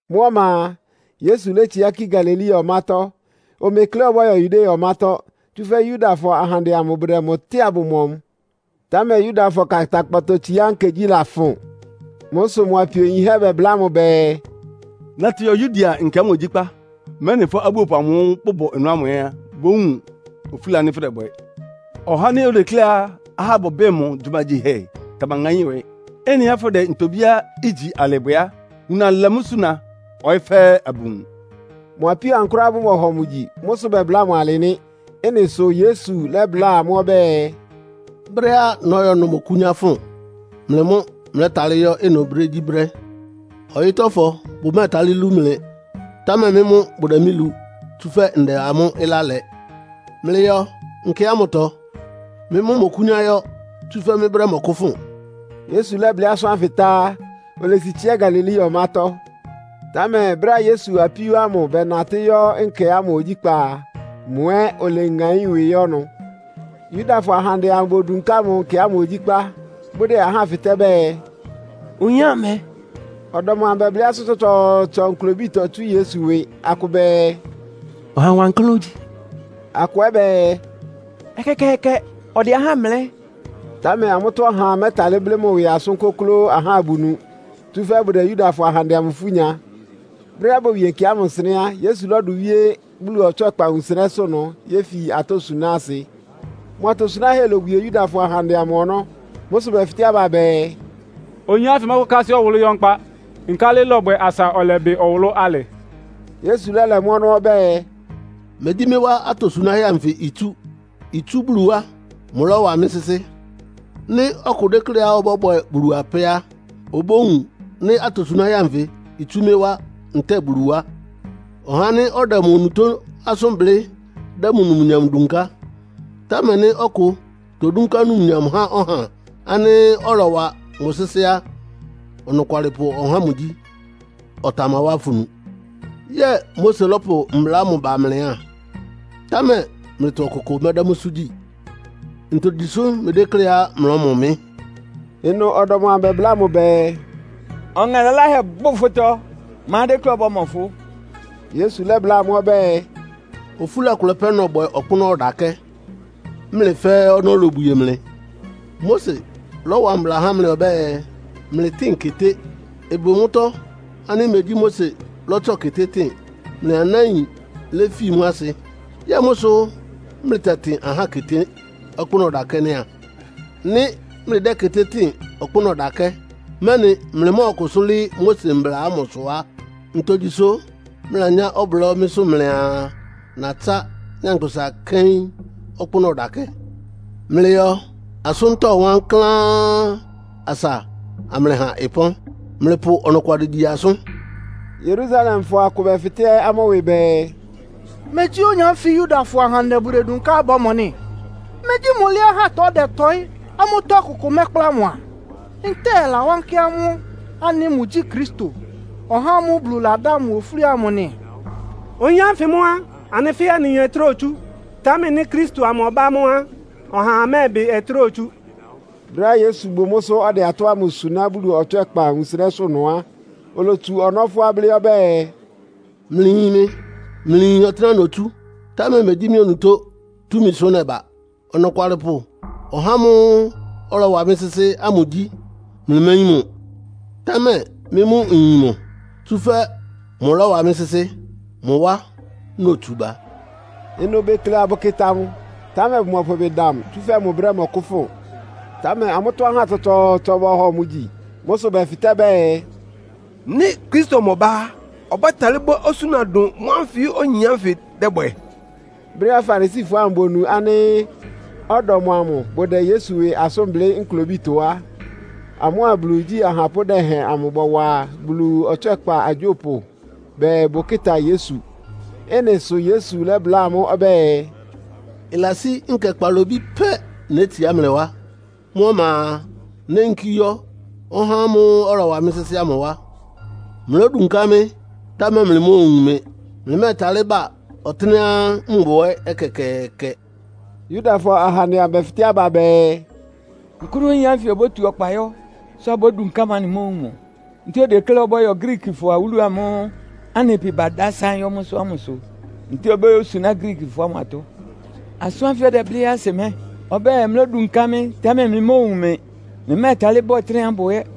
Mʋ́ ɔma a, Yesu létsiá kí Galilea ɔmátɔ́. Omekleá ɔbɔ́yɔ Yudea ɔmátɔ́, tsúfɛ́ Yudafɔ ahandɛ amʋ bʋdɛ mʋ tɛ́ɛ abʋmɔ mʋ. Támɛ Yudafɔ Kantankpatɔtsiá Nkegyí lafʋn. Mʋ́ sʋ mʋ apio yinhɛ́ bɛbláa mʋ bɛɛ, “Natɩ yɔ Yudea nkɛ ámʋ ogyíkpá, mɛ́nɩ fʋ́ abúopʋ amʋ́ʋ́ bʋbʋ ɩnʋ ámʋ ɛ́ bówun ofúla ánɩ́ fʋdɛbwɛ. Ɔhá ánɩ́ odekléá ahá bʋbɩ́ɩ mʋ gyumagyihɛ tamaŋáín ɩwɩ. Ɩ́nɩá fʋ́dɛ ntobíá igyi alɩ bwɛ á, wuna lɛ mʋ́ suna, ɔyɩ́ fɛ́ɛ́ abʋwun.” (Mʋ apíó ámʋ kʋ́ráá bʋmɔhɔ mʋ gyi. Mʋ́ sʋ bɛbláa mʋ alɩ nɩ́.) Ɩ́nɩ sʋ Yesu lɛ́bláa amʋ́ ɔbɛ́ɛ, “Brɛ́á nɔ́yɔ ɩnʋ mɔkʋ́nyá fʋn. Mlɩ mʋ́ mlɛ́talɩ́ yɔ́ ɩnʋ brégyíbrɛ́. Ɔyɩ́tɔ́fɔ bʋmɛ́ɛtalɩ́ lú mlɩ, támɛ mɩ́ mʋ́ bʋdɛ mɩ́ lu, tsúfɛ́ ndɛ amʋ́ ɩlá lɛ. Mlɩyɔ nkɛ ámʋtɔ. Mɩ́ mʋ́ mmɔkʋ́nyá yɔ́, tsúfɛ́ mɩ́ brɛ́ mɔkʋ́fʋn.” Yesu lɛ́blɩ́ asʋ́n ánfɩ tá á, olesi tsiá Galilea ɔmátɔ́. Támɛ brɛ́á Yesu apíó ámʋ bɛnatɩ́ yɔ́ nkɛ ámʋ ogyíkpá a, mʋ ɛ́ oleŋaín ɩwɩ yɔ́ ɩnʋ. Yudafɔ ahandɛ amʋ bodunká mʋ nkɛ ámʋ ogyíkpá, bʋdɛ ahá fɩtɛ́ bɛɛ, “Oyin ámʋ mɛ?” Ɔdɔm amʋ bɛblɩ́ asʋ́n tsɔtsɔɔtsɔ nklobítɔ tsú Yesu ɩwɩ. Akʋ bɛɛ, “Ɔha wankláán ogyi.” Akʋ ɛ́ bɛɛ, “Ɛkɛkɛɛkɛ, ɔdɛ ahá mlɛ́.” Támɛ amʋ́tɔ́ ɔhaa mɛ́talɩ́ blɩ́ mʋ ɩwɩ asʋ́n kʋ́klʋ́ ahá abʋnu, tsúfɛ́ bʋdɛ Yudafɔ ahandɛ amʋ ifú nya. Brɛ́á bowie nkɛ ámʋ nsɩnɛ́ á, Yesu lɔ́dʋ wíé Bulu ɔtswɛ́kpa wunsɩnɛ́sʋ́ ɩnʋ yéfi atɔ́ suná asɩ. Mʋ atosunáhɛ́ lobwie Yudafɔ ahandɛ amʋ ɔnɔ́. Mʋ́ sʋ bɛfɩtɛ́ aba bɛɛ, “Oyin ánfɩ mɔ́kʋ́kásɩ́ ɔwʋlʋ́ yɔ́ nkpá. Nkálɩ ɩlɔbwɛ asa ɔlɛbɩ ɔwʋlʋ́ alɩ?” Yesu lɛ́lɛ mʋ́ ɔnɔ́ ɔbɛ́ɛ, “Megyí mɩ́ wá atosunáhɛ́ anfɩ itsú. Itsú Bulu wá. Mʋlɔ́wa mɩ́ sɩ́sɩ́. Nɩ́ ɔkʋ dékléá ɔbɔ́bwɛ Bulu apɛ́ á, obówun nɩ́ atosunáhɛ́ anfɩ itsú mɩ́ wá ntɛ́ɛ Bulu wá. Ɔhá ánɩ́ ɔdɛ mʋ onutó asʋ́n blɩ́ dɛ́ mʋ numnyam dunká. Támɛ nɩ́ ɔkʋ todúnká numnyam há ɔhá ánɩ́ ɔlɔwa mʋ sɩ́sɩ́ á, ɔnɔkwalɩpʋ ɔhá ámʋ gyí. Ɔtamawá afunu. Yɛ́ɛ Mose lɔ́pʋ mbla ámʋ ba mlɩ a? Támɛ mlɩtɔ ɔkʋkʋ mɛ́dɛ́ mʋ́sʋ́ gyi. Ntogyi sʋ mlɩdékléá mlɔ́mɔ mɩ́?” Ɩnʋ ɔdɔm amʋ bɛbláa mʋ bɛɛ, “Ɔŋɛ laláhɛ bʋ fʋtɔ! Ma dékléá ɔbɔ́mɔ fʋ́?” Yesu lɛ́bláa amʋ́ ɔbɛ́ɛ, “Ofúla kʋlɛ pɛ́ nɔbwɛ ɔkpʋ́nʋ́ ɔdakɛ́, mlɩ fɛ́ɛ́ ɔnɔ́ lobwie mlɩ. Mose lɔ́wa mbla há mlɩ ɔbɛ́ɛ, mlɩtɩ́ɩn keté. (Ɩbʋ mʋ́tɔ́ ánɩ́ megyí Mose lɔ́tsɔ keté tɩ́n, mlɩ anáin léfi mʋ́ asɩ.) Yɛ́ɛ mʋ́ sʋ́ mlɩtɛtɩn ahá keté ɔkpʋ́nʋ́ ɔdakɛ́ nɩ́ a? Nɩ́ mlɩdɛ́ keté tɩ́ɩn ɔkpʋ́nʋ́ ɔdakɛ́, mɛ́nɩ mlɩmɔ́ɔkʋsʋ́ lɩ́ɩ́ Mose mbla ámʋsʋ á, ntogyi sʋ́ mlɩlanyá ɔblɔ́ mɩ́sʋ́ mlɩaa, natsá nyankpʋsa kɛ́ɩ́n ɔkpʋ́nʋ́ ɔdakɛ́? Mlɩyɔ asʋ́ntɔ́ wankláán, asa amlɩha ɩpɔ́n. Mlɩpʋ ɔnɔkwalɩ gyi asʋ́n.” Yerusalemfɔ akʋ bɛfɩtɛ́ amʋ́ ɩwɩ bɛɛ, “Megyí oyin ánfɩ Yudafɔ ahandɛ bʋdedunká abʋmɔ nɩ́? Megyí mʋ lɩ́ɩ́ ahátɔ ɔdɛtɔɩ́, amʋ́tɔ́ ɔkʋkʋ mɛ́kpla mʋ a? Ntɛ́ɛ ɩlawánkɩ́ amʋ́ ánɩ́ mʋgyí Kristo, (ɔhá ámʋ́ʋ́ Bulu ladá mʋ ofúli amʋ) nɩ? Oyin ánfɩ mʋ́ a, anɩ fɛ́ɛ́ anɩyin ɔtɩ́nɛ́á otsú, támɛ nɩ́ Kristo ámʋ ɔbá á, ɔhaa mɛ́ɛbɩ ɔtɩ́nɛ́á otsú.” Brɛ́á Yesu bʋ mʋ́sʋ́ ɔdɛ atɔ́ ámʋ suná Bulu ɔtswɛ́kpa wunsɩnɛ́sʋ́ ɩnʋ á, olotsu ɔnɔ́ fʋ́á blɩ́ ɔbɛ́ɛ, “Mlɩyin mɩ, mlɩyin ɔtɩ́nɛ́á notsú, támɛ megyí mɩ́ onutó túmisʋ nɛba. Ɔnɔkwalɩpʋ ɔhá ámʋ́ʋ́ ɔlɔwa mɩ́ sɩ́sɩ́ ámʋ gyí. Mlɩméyín mʋ. Támɛ mɩ́ mʋ́ nyin mʋ, tsúfɛ́ mʋlɔ́wa mɩ́ sɩ́sɩ́. Mʋ wá notsu ba.” Ɩnʋ bekle abʋkɩta mʋ, támɛ bʋmɔpʋ ɩbɩ da mʋ, tsúfɛ́ mʋ brɛ́ mɔkʋ́fʋn. Támɛ amʋ́tɔ́ ahá tsɔtsɔɔtsɔ bɔhɔ mʋ gyi. Mʋ́ sʋ bɛfɩtɛ́ bɛɛ “Nɩ́ Kristo amʋ ɔbá á, ɔbɛ́talɩ́ bwɛ́ osúna dʋn mʋ́ ánfɩ oyin ánfɩ dɛ́bwɛ?” Brɛ́á Farisifɔ ámʋ bonu ánɩ́ ɔdɔm amʋ bʋdɛ Yesu ɩwɩ asʋ́n blɩ́ nklobítɔ á, amʋ́a Bulu igyí ahapʋ́ dɛhɛn amʋ bɔwa Bulu ɔtswɛ́kpa agyópʋ bɛɛ bʋkɩ́ta Yesu. Ɩ́nɩ sʋ Yesu lɛ́bláa amʋ́ ɔbɛ́ɛ, “Ɩlasí nkɛ kpalobí pɛ́ nétsiá mlɩ wá. Mʋ́ ɔma a, néyinkí yɔ́ ɔhá ámʋ́ʋ́ ɔlɔwa mɩ́ sɩ́sɩ́ ámʋ wá. Mlódunká mɩ́, támɛ mlɩmóowun mɩ. Mlɩmɛ́ɛtalɩ́ ba ɔtɩ́nɛ́á mbʋ ɛ́ ɛkɛkɛɛkɛ.” Yudafɔ ahandɛ amʋ bɛfɩtɛ́ aba bɛɛ, “Nkʋ́nʋ́ oyin ánfɩ obótu ɔkpa yɔ́, sʋ abódunká mʋ anɩmóowun mʋ? Ntɛ́ɛ odekléá ɔbɔ́yɔ Griikifɔ awúlu amʋ́ʋ́ anɩ pɩ badásáɩ́n yɔ́ mʋ́sʋ́ ámʋsʋ, ntɛ́ɛ obóyósuná Griikifɔ ámʋ atɔ́? Asʋ́n ánfɩ ɔdɛblɩ́ ɛ́ asɩ mɛ́? Ɔbɛ́ɛ, ‘Mlódunká mɩ́, támɛ mlɩmóowun mɩ. Mlɩmɛ́ɛtalɩ́ ba ɔtɩ́nɛ́á mbʋ ɛ́.’”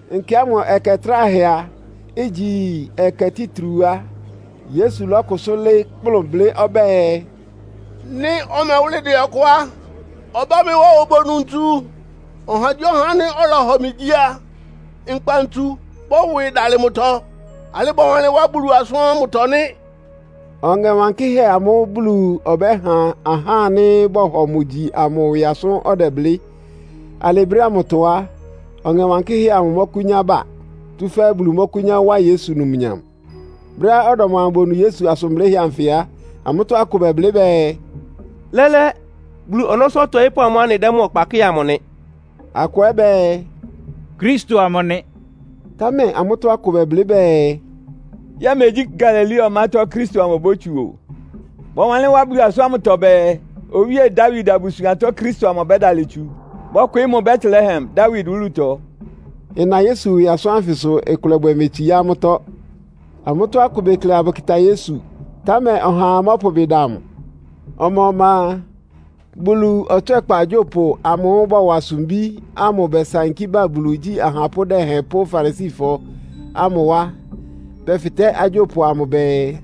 Nkɛ ámʋ ɛkɛ tráhɛá ígyi ɛkɛ títriu á, Yesu lɔ́kʋsʋ́ lɩ́ɩ́ kplʋn blɩ́ ɔbɛ́ɛ, “Nɩ́ ɔmɛwʋ́lɩ dɛ ɔkʋ á, ɔbá mɩ́ wá obonu ntsu. Ɔhagyíɔha ánɩ́ ɔlɔhɔ mɩ gyi a, ‘Nkpa ntsu bɔ́wɩ dalɩ mʋtɔ.’ Alɩ́ bɔwanlɩ́n wá Bulu asʋ́n ámʋtɔ nɩ́.” (Ɔŋɛ Wankɩ́hɛ́ amʋ́ʋ́ Bulu ɔbɛ́ha ahá ánɩ́ bɔ́hɔ mʋ gyi amʋ ɩwɩ asʋ́n ɔdɛblɩ́. Alɩ brɛ́ ámʋtɔ á, Ɔŋɛ Wankɩ́hɛ́ amʋ mɔ́kʋ́nyá ba, tsúfɛ́ Bulu mɔ́kʋ́nyá wá Yesu numnyam.) Brɛ́á ɔdɔm amʋ bonu Yesu asʋn blɩ́hɛ́ anfɩ á, amʋ́tɔ́ akʋ bɛblɩ́ bɛɛ, “Lɛ́lɛ́, Bulu ɔnɔ́sʋ́ ɔtɔɩ́pʋ́ amʋ́ʋ́ anɩdɛ́ mʋ ɔkpa kɩ́ɩ amʋ nɩ.” Akʋ ɛ́ bɛɛ, “Kristo amʋ nɩ!” Támɛ amʋ́tɔ́ akʋ ɛ́ bɛblɩ́ bɛɛ, “Yɛ́ɛ megyí Galilea ɔmátɔ́ Kristo amʋ obótsu o. Bɔwanlɩ́n wá Bulu asʋ́n ámʋtɔ bɛɛ, Owíe Dawid abusuantɔ Kristo amʋ ɔbɛ́dalɩ tsu. Bɔ́kwɩɩ́ mʋ Betlehem, Dawid wúlutɔ.” Ɩna Yesu ɩwɩ asʋ́n ánfɩ sʋ ɩkʋlɛbwɛ metsiá amʋ́tɔ́. Amʋ́tɔ́ akʋ bekle abʋkɩta Yesu, támɛ ɔhaa mɔ́pʋ ɩbɩ da mʋ. Ɔma-ɔma a, Bulu ɔtswɛ́kpa agyópʋ amʋ́ʋ́ bɔwa sumbí ámʋ bɛsankí ba Bulu igyí ahapʋ́ dɛhɛn pʋ́ Farisifɔ ámʋ wá. Bɛfɩtɛ́ agyópʋ amʋ bɛɛ,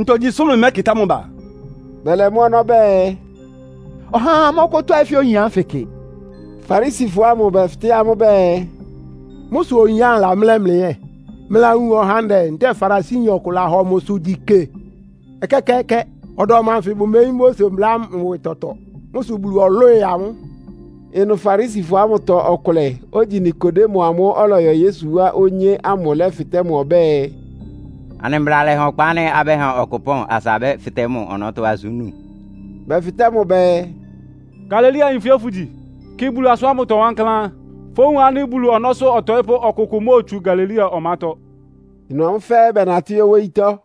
“Ntogyi sʋ mlɩmɛ́kɩtá mʋ ba?” Bɛlɛ mʋ́ ɔnɔ́ bɛɛ, “Ɔhaa mɔ́kʋ́tɔ́ɩ́ fɛ́ oyin ánfɩ kɩ!” Farisifɔ ámʋ bɛfɩtɛ́ amʋ́ bɛɛ, “Mʋ́ sʋ oyin ámʋ lamlɛ́ mlɩ ɛ́. Mlɩlawun ɔhandɛ ntɛ́ɛ Farisiyin ɔkʋ lahɔ mʋ gyi kɩ? Ɛkɛkɛɛkɛ! Ɔdɔm anfɩ bʋmeyín Mose mbla ámʋ ɩwɩ tɔtɔ. Mʋ́ sʋ Bulu ɔlwɩ́ɩ amʋ́.” Ɩnʋ Farisifɔ ámʋtɔ ɔkʋlɛ, ogyi Nikodemo amʋ́ʋ́ ɔlɔyɔ Yesu wá onyé ámʋ lɛ́fɩtɛ́ amʋ́ ɔbɛ́ɛ, “Anɩ mbla lɛha ɔkpa ánɩ́ abɛ́ha ɔkʋ ɩpɔ́n asa abɛ́fɩtɛ́ mʋ ɔnɔ́tɔ́ asʋ́n nú?” Bɛfɩtɛ́ mʋ bɛɛ, “Galileayin fʋ́ ɛ́ fʋ́gyi? Kɩ Bulu asʋ́n ámʋtɔ wankláán. Fówun ánɩ́ Bulu ɔnɔ́sʋ́ ɔtɔɩ́pʋ́ ɔkʋkʋʋkʋ móotsu Galilea ɔmátɔ́.” [Ɩnʋ amʋ́ fɛ́ɛ́ bɛnatɩ́ yɔ́ wóyítɔ́.